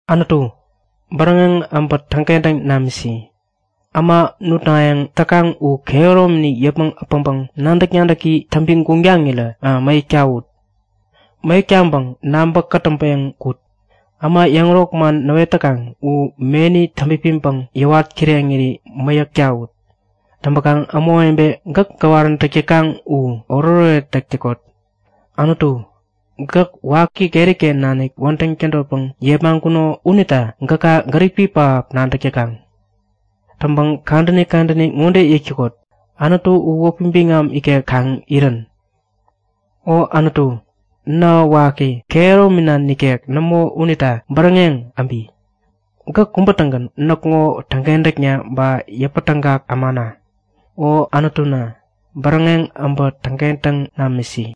Anutu, bäräŋeŋ äbä täŋkentäŋ namisi! Äma nutnayäŋ täkaŋ u kehäromini yäpmäŋ äpäŋpäŋ nadäk-nadäki täŋpi guŋtaŋirä mäyäk tawut. Mäyäk taŋpäŋ nabä-kätäŋpeŋ kut! Äma yäŋärok man näwet täkaŋ u meni täŋpipiŋpäŋ yäwat kireŋiri mäyäk tawut. Täŋpäkaŋ ämawebe gäk gäwaräntäk täkaŋ u oretoret täk täkot! Anutu, gäk waki keriken nanik wädäŋ tädotpäŋ yepmaŋkuno unita gäka gäripi pähap nadäk täkaŋ. Täŋpäŋ kadäni kadäni ŋode yäk täkot; Anutu u wäpi biŋam ikek kaŋ irän! O Anutu, nähä waki kehäromina nikek nämo unita bäräŋeŋ äbi! Gäk kubä-tägän näkŋo täŋkentäk ba yäpätägak ämana. O Anutuna, bäräŋeŋ äbä täŋkentäŋ namisi!